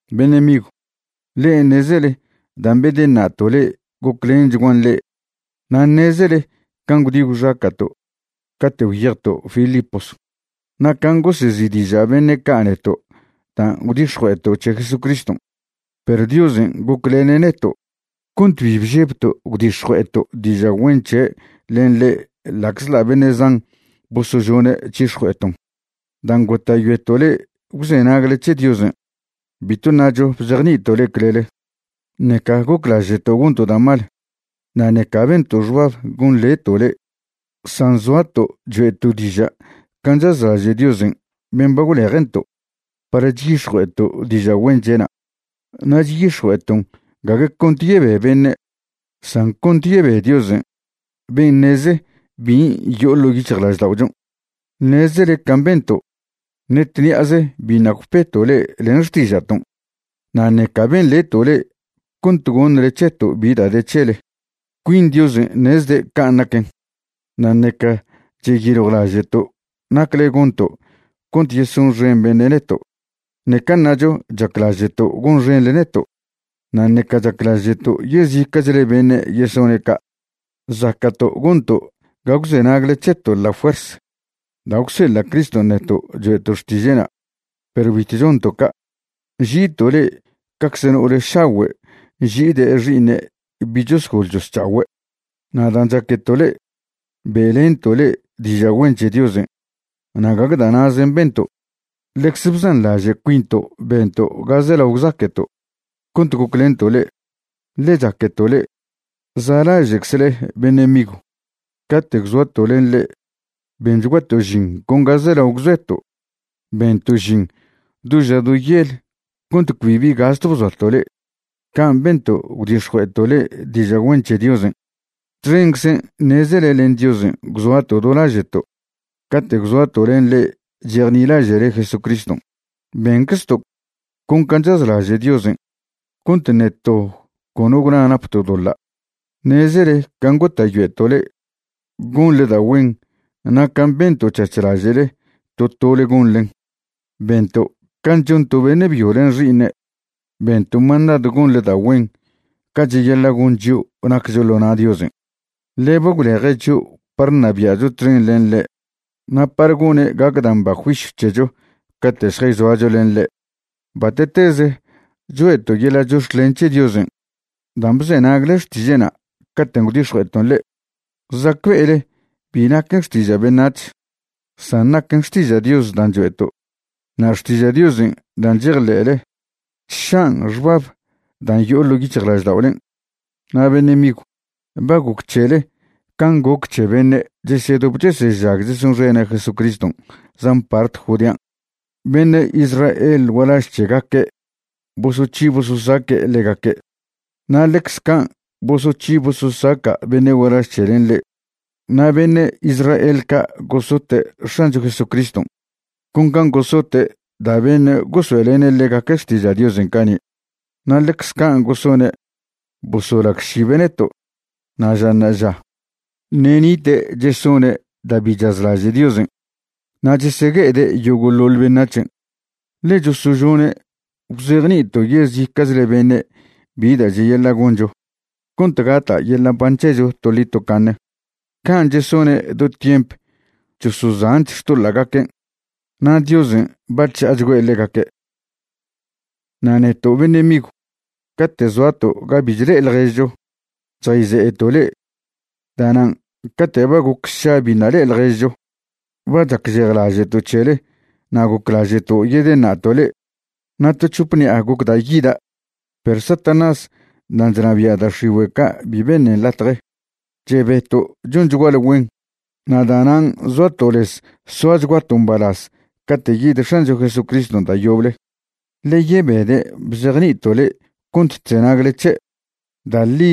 Beṉe' migw, le'e ṉezele dan' bedeṉa'to' le'e goclenchguan le'e. Na' ṉezele can' gwdi gwxaca'to' cate' gwyejto' Filipos, na' can' gosezi'diža' beṉe' ca' neto' dan' gwdix̱jue'eto' c̱he Jesucriston'. Perw Diosen' goclene' neto' cont bi bžebto' gwdix̱jue'eto' diža' güen c̱he' len le'e ḻa'czḻa' beṉe' zan bosožone' c̱hix̱jue'eton'. Dan' gota'yoeto' le'e gwzenagle c̱he Diosen' bitw ṉacho bzejni'ito' le'e clele, ṉeca goclaže'to' gonto' da' mal, na' ṉeca bento' xbab gonḻeto' le'e. San zoato' choe'to' diža' can' chazlaže' Diosen' ben' ba gwleje'nto' par chyix̱jue'eto' diža' güen c̱he'na'. Na' chyix̱jue'eton' gague cont yebe beṉe', san cont yebe Diosen' ben' ṉeze bin' yo'o ḻo' yic̱hjlažda'ochon'. Ṉezele can' bento', ṉe tṉi'aze biṉa' gwpeto' le'e len xtiža'ton', na' ṉeca benḻeto' le'e cont gonḻe c̱heto' bi da' de c̱hele. Cuin Diosen' ṉezde' can' naquen. Na' ṉeca cheyiljwlaže'to' nacle gonto' cont yesonxen beṉe' neto'. Ṉeca ṉacho chaclaže'to' gonxeṉle neto', na' ṉeca chaclaže'to' yezica'chle beṉe' yesone' ca'. Zaca'to' gonto' ga gwzenagle c̱heto' la fuers da' gwseḻa' Criston' neto' choe'to' xtiže'na', perw bitw chonto' ca'. Nži'ito' le'e cacze no'ole šagüe' nži'ide' xi'iṉe' bi' chosgol chosc̱ha'ogüe'. Na' dan' chaqueto' le'e, be'lento' le'e diža' güen c̱he Diosen'. Na' gague da' na'zen' bento', ḻecze bzanḻaže' cuinto' bento' ga zelao gwzaque'to' cont goclento' le'e, ḻe chaqueto' le'e. Za'laže'czle beṉe' migw, cate' gwzoato' len le'e benchguato' žin con ga zelao gwzoeto'. Bento' žin do ža do yel cont cbi bi gastw bzoato' le'e. Can' bento' gwdix̱jue'eto' le'e diža' güen c̱he Diosen'. Txenczen' ṉezele len Diosen' gwzoato' do laže'to' cate' gwzoato' len le'e chejnilaže'le Jesucriston'. Benczto' con can' chazlaže' Diosen' cont ṉe to cono gwna napto' doḻa'. Ṉezele can' gota'yoeto' le'e gonḻe da' güen na' can' bento' c̱hac̱h laže' to tole gonḻen. Bento' can' chon to beṉe' byo len xi'iṉe'. Bento' mandadw gonḻe da' güen ca cheyaḻa' gon chio' naccho ḻo na' Diosen', ḻe ba gwleje' chio' par ṉabia'cho txen len ḻe' na' par gone' gac da' mba juisyw c̱hecho cate' šjayzoacho len ḻe'. Bate'teze choe'to' yeḻa' chox̱clen c̱he Diosen' dan' bzenagle xtiže'na' caten' gwdix̱jue'eton' le'e. Zacbe'ele bi naquen xtiža' beṉac̱h, san naquen xtiža' Dios dan' choe'to'. Na' xtiža' Diosen' dan' chejḻe'le chša'an xbab dan' yo'o ḻo' yic̱hjlažda'olen'. Na' bene' migw, ba goc c̱hele can' goc c̱he beṉe' chesedop chesežag chesonxene' Jesucriston' zan part Judean'. Beṉe' Israel gualaž c̱hegaque' bosoc̱hi bososaque' ḻegaque', na' ḻecze can' bosoc̱hi bososaca' beṉe' gualaž c̱helen' le'e. Na' beṉe' Israel ca' gosote' X̱ancho Jesucriston' con can' gosote' da' beṉe' gosoe'lene' ḻegaque' xtiža' Diosen' cani'. Na' ḻecze can' gosone' bosolagšibe' neto'. Na' ža ṉa'aža ṉe' nite' chesone' da' bi chazlaže' Diosen' na' chesegue'ede' yogo'ḻoḻ beṉac̱hen', ḻe chosožone' gwzejni'ito' yezica'chle beṉe' bi da' cheyaḻa' goncho cont gata' yeḻa' mban c̱hecho toḻi tocaṉe. Can' chesone' do tiemp chosozanch xtoḻa'gaquen' na' Diosen' ba chža'achgüe' ḻegaque'. Na' neto' beṉe' migw, cate' zoato' ga bi chle'e ḻježcho, chjayze'eto' le'e. Da'nan' cate' ba goc sša biṉa' le'e ḻježcho ba chacžejlaže'to' c̱hele na' goclaže'to' yedeṉa'to' le'e. Na' to c̱hop ṉi'a gocda' yida', perw Satanás dan' chnabia' da' x̱igüe' ca' bi beṉen latje. Chebeto' chonchguale güen na' da'nan' zoato' lez soachguato' mbalaz cate' yid X̱ancho Jesucriston' da' yoble, ḻe yebede' bzjeni'ito' le'e cont chzenagle c̱he'. Da' ḻi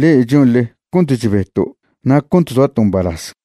le'e chonḻe cont chbeto' na' cont zoato' mbalaz.